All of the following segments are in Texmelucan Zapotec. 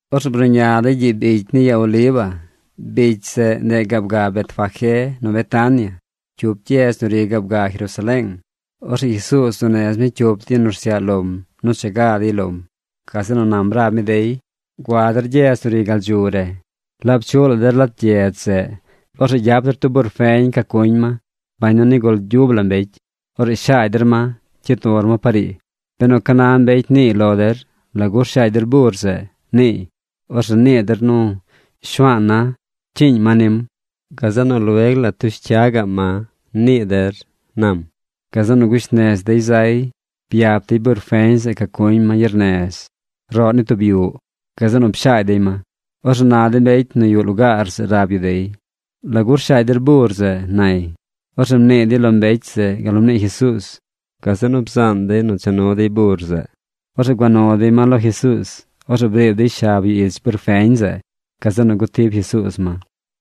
Orzeꞌ bruꞌña dey gyiꞌ bicy ni ya Oliva. Bicy zeꞌ, ndeꞌ gaab ga Betfagé nu Betania, cyup gyedz nu ri gaab ga Jerusaleeng. Orzeꞌ Jesuuz bzuu nez mi cyup de yu nu rsyaꞌ lom nu cha ga dey lom. Gazeꞌ nu nam rab mi dey: ―Gua der gyedz nu ri gal dzu re. Laab chuꞌ la der lat gyedz zeꞌ, orzeꞌ gyap der tub bur feñ ca cuñ ma: bañ nu nigul gyub la mbecy. Orzeꞌ shaagy der ma, cyid nur ma par ii. Benu ca na mbecy niiy lo der: “¿Lagu rshaagy der bur zeꞌ?” niiy, orzeꞌ nii der nu “Shuaan na cyiiñ ma nim. Gazeꞌ nu lueg la tush cya gaꞌm ma”, nii der ―nam. Gazeꞌ nu gush nez dey zay. Byap dey bur feñ zeꞌ ca cuñ ma gyernez, roꞌ ni tub yuꞌ. Gazeꞌ nu pshaagy dey ma. Orzeꞌ na de mbecy nu yuꞌ lugaar zeꞌ rab yu dey: ―¿Lagu rshaagy der bur zeꞌ? ―nay. Orzeꞌ mnii dey lo mbecy zeꞌ gal nu mnii Jesuuz. Gazeꞌ nu bzaan dey nu cha nu dey bur zeꞌ. Orzeꞌ gua nu dey ma lo Jesuuz. Orzeꞌ briib dey shab yu ich bur feñ zeꞌ. Gazeꞌ nu gutib Jesuuz ma.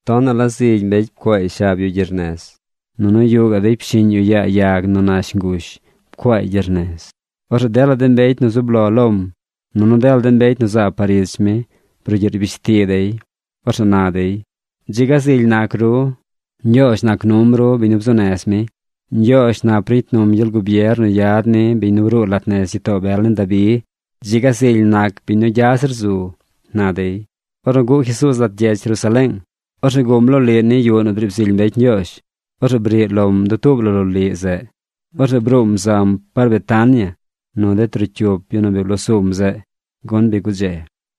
Tonaꞌ la zigy mbecy pcuaay shab yu gyernez. Nunu yuꞌ gaꞌ dey pshiꞌñ yu yaa yag nu nash ngush pcuaay gyernez. Orzeꞌ dela de mbecy nu zub lo lom nunu dela de mbecy nu zaab par ich mi brugyiꞌ rbishti dey. Orzeꞌ na dey: ―¡Dzi ga zily nac ru! ¡Ñgyoozh nac num ru biñ nu bzuu nez mi! ¡Ñgyoozh nap ricy num gyel gubier nu yad ni biñ nu bruu lat nez gyitoo bel nin Dabi! ¡Dzi ga zily nac biñ nu gya zir zu! ―na dey. Ornu guꞌ Jesuuz lat gyedz Jerusaleeng, orzeꞌ guꞌm loliꞌ ni yuꞌ nu driib zily mbecy Ñgyoozh. Orzeꞌ briꞌ lom dutuub la loliꞌ zeꞌ. Orzeꞌ bruum zam par Betania nu de trocyup yu nu bi bloo sum zeꞌ, gun bi gudze.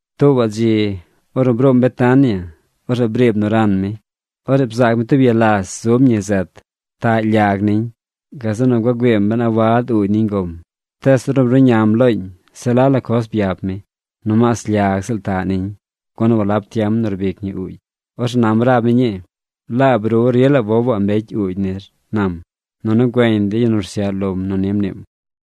Tuubaꞌ dzi, ornu bruum Betania, orzeꞌ briib nu ran mi. Orzeꞌ bzaac mi tub ya las zub ñi zet. Taꞌ lyag niñ. Gazeꞌ nu gua güiim ben a wad uugy niñ gom. Tees ornu bruꞌñam looñ se la la coz byap mi. Nomaas lyag ziꞌl taꞌ niñ, gun walab tiem nu rbic ñi uugy. Orzeꞌ nam rab mi ñii: ―¡Laab ru rila wowaꞌ mbecy uugy nir! ―nam. Nunu güeñ de yu nu rsyaꞌ lom nu ni mniim.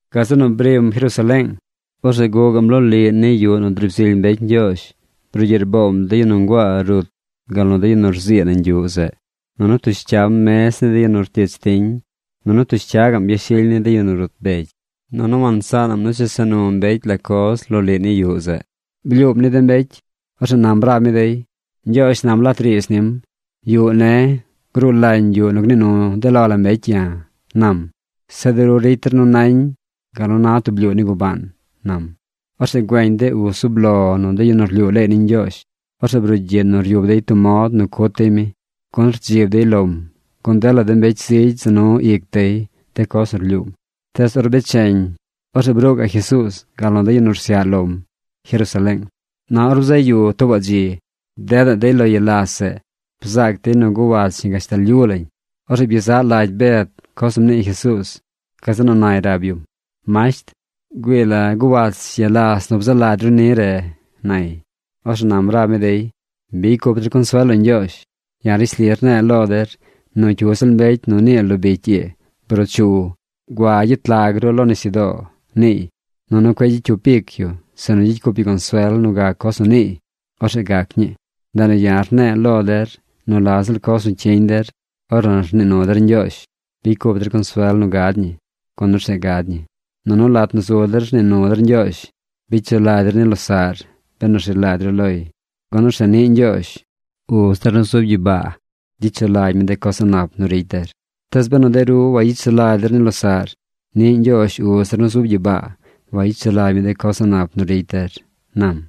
Gazeꞌ nu brim Jerusaleeng. Orzeꞌ guꞌ gaꞌm loliꞌ ni yuꞌ nu driib zily mbecy Ñgyoozh brugyiꞌ rboom de yu nu nguaa rut gal nu de yu nu rzii nañ yuꞌ zeꞌ. Nunu ptush cyam mez ni de yu nu rtich tiñ. Nunu ptush cya gaꞌm yashily ni de yu nu rut begy. Nunu wansaanaꞌm nu chesa nu mbecy la coz loliꞌ ni yuꞌ zeꞌ. Blyuum ni de mbecy. Orzeꞌ nam rab mi dey: ―Ñgyoozh nam lat riidz nim: “Yuꞌ ne̱ gruu lañ yuꞌ nu gnii nu de lo la mbecy ya̱”, nam. Zeꞌ de ru ricy der nu nañ gal nu na tub blyuu ni gubaan ―nam. Orzeꞌ güeñ de uz zub lo nu de yu nu rlyuu leey ni Ñgyoozh. Orzeꞌ brugyiꞌ nu ryub dey tub mod nu cut dey mi, gun rdzib dey lom, gun dela de mbecy zigy za nu ic dey de coz nu rlyuum. Tees or becheñ, orzeꞌ bruu gaꞌ Jesuuz gal nu de yu nu rsyaꞌ lom Jerusaleeng. Na or bzaꞌ yu tuubaꞌ dzi bdedaꞌ dey lo ya las zeꞌ. Bzaac dey nu guwach ñi gashtal lyu lañ. Orzeꞌ byezaꞌ lagy Bed coz nu mnii Jesuuz. Gazeꞌ nu nay rab yum: ―Masht, ¡güii la! Guwach ya las nu bzaa lagy ru ni re ―nay. Orzeꞌ nam rab mi dey: ―Bicy cup der consuel lo Ñgyoozh. Ya̱ rishli rne̱e̱ lo der nu cyu ziꞌl mbecy nu nii lo bicy ii: “Bruu chu. Gua gyet lag ru lo nisyudoo”, niiy, nunu cueꞌ gyicy cyup ic yu sinu gyicy cup yu consuel nu gac coz nu niiy, orzeꞌ gac ñii. Ndeꞌ nu ya̱ rne̱e̱ lo der nu la ziꞌl coz nu cyiñ der ornu rnii nu der Ñgyoozh, bicy cup der consuel nu gad ñi, gun orzeꞌ gad ñi. Nunu lat nu zu der rnii nu der Ñgyoozh, bicy sulagy der ni losaꞌr benu rzi lagy ru loy, gun orzeꞌ niꞌ Ñgyoozh, uz der nu zub gyibaa, gyicy sulagy mi de coz a̱ꞌ nap nu ricy der. Tees benu de ru wayicy sulagy der ni losaꞌr, niꞌ Ñgyoozh uz der nu zub gyibaa wayicy sulagy mi de coz a̱ꞌ nap nu ricy der ―nam.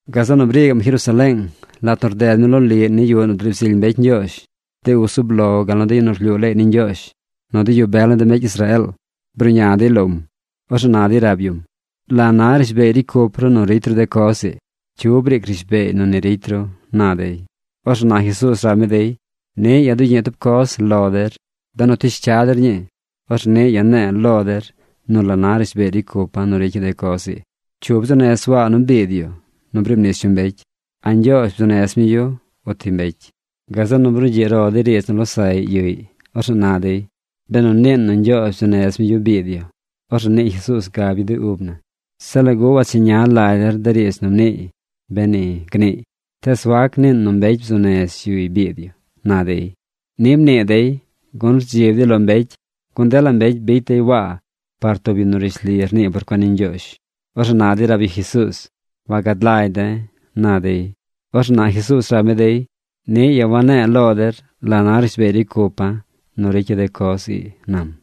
Gazeꞌ nu brii gaꞌm Jerusaleeng. Lat nu rded mi loliꞌ ni yuꞌ nu driib zily mbecy Ñgyoozh, de uz zub lo gal nu de yu nu rlyuu leey ni Ñgyoozh nu de yu bel ni de mbecy Israeel bruꞌña dey lom. Orzeꞌ na dey rab yum: ―¿La na rishbeey ricy cup ru nu ricy ru de coz ii? ¿Cyu briic rishbeey nu ni ricy ru? ―na dey. Orzeꞌ na Jesuuz rab mi dey: ―Niꞌ ya̱ dugyiꞌ tub coz lo der. Benu tush cya der ñii, orzeꞌ niꞌ ya̱ ne̱e̱ lo der nu la na rishbeey ricy cupa̱ nu ricya̱ de coz ii. ¿Cyu bzuu nez Waa nu biid yu nu briib nis yu mbecy? ¿A Ñgyoozh bzuu nez mi yu uti mbecy? Gazeꞌ nu brugyiꞌ ro dey riidz nu losaꞌy yuꞌy. Orzeꞌ na dey: ―Benu niin nu Ñgyoozh bzuu nez mi yu biid yu, orzeꞌ nii Jesuuz gab yu de ub na: “Zeꞌ ¿lagu wancheña lagy der de riidz nu mniiy, beni?”, gniiy. Tees wac niin nu mbecy bzuu nez yuy biid yu ―na dey. Ni mnii dey, gun rdzib dey lo mbecy, gun dela mbecy bicy dey Waa par tub yu nu rishli rnii por cuen ni Ñgyoozh. Orzeꞌ na dey rab yu Jesuuz: ―Wagad lagy de̱ ―na dey. Orzeꞌ na Jesuuz rab mi dey: ―Niꞌ ya̱ wane̱e̱ lo der la na rishbeey ricy cupa̱ nu ricya̱ de coz ii ―nam.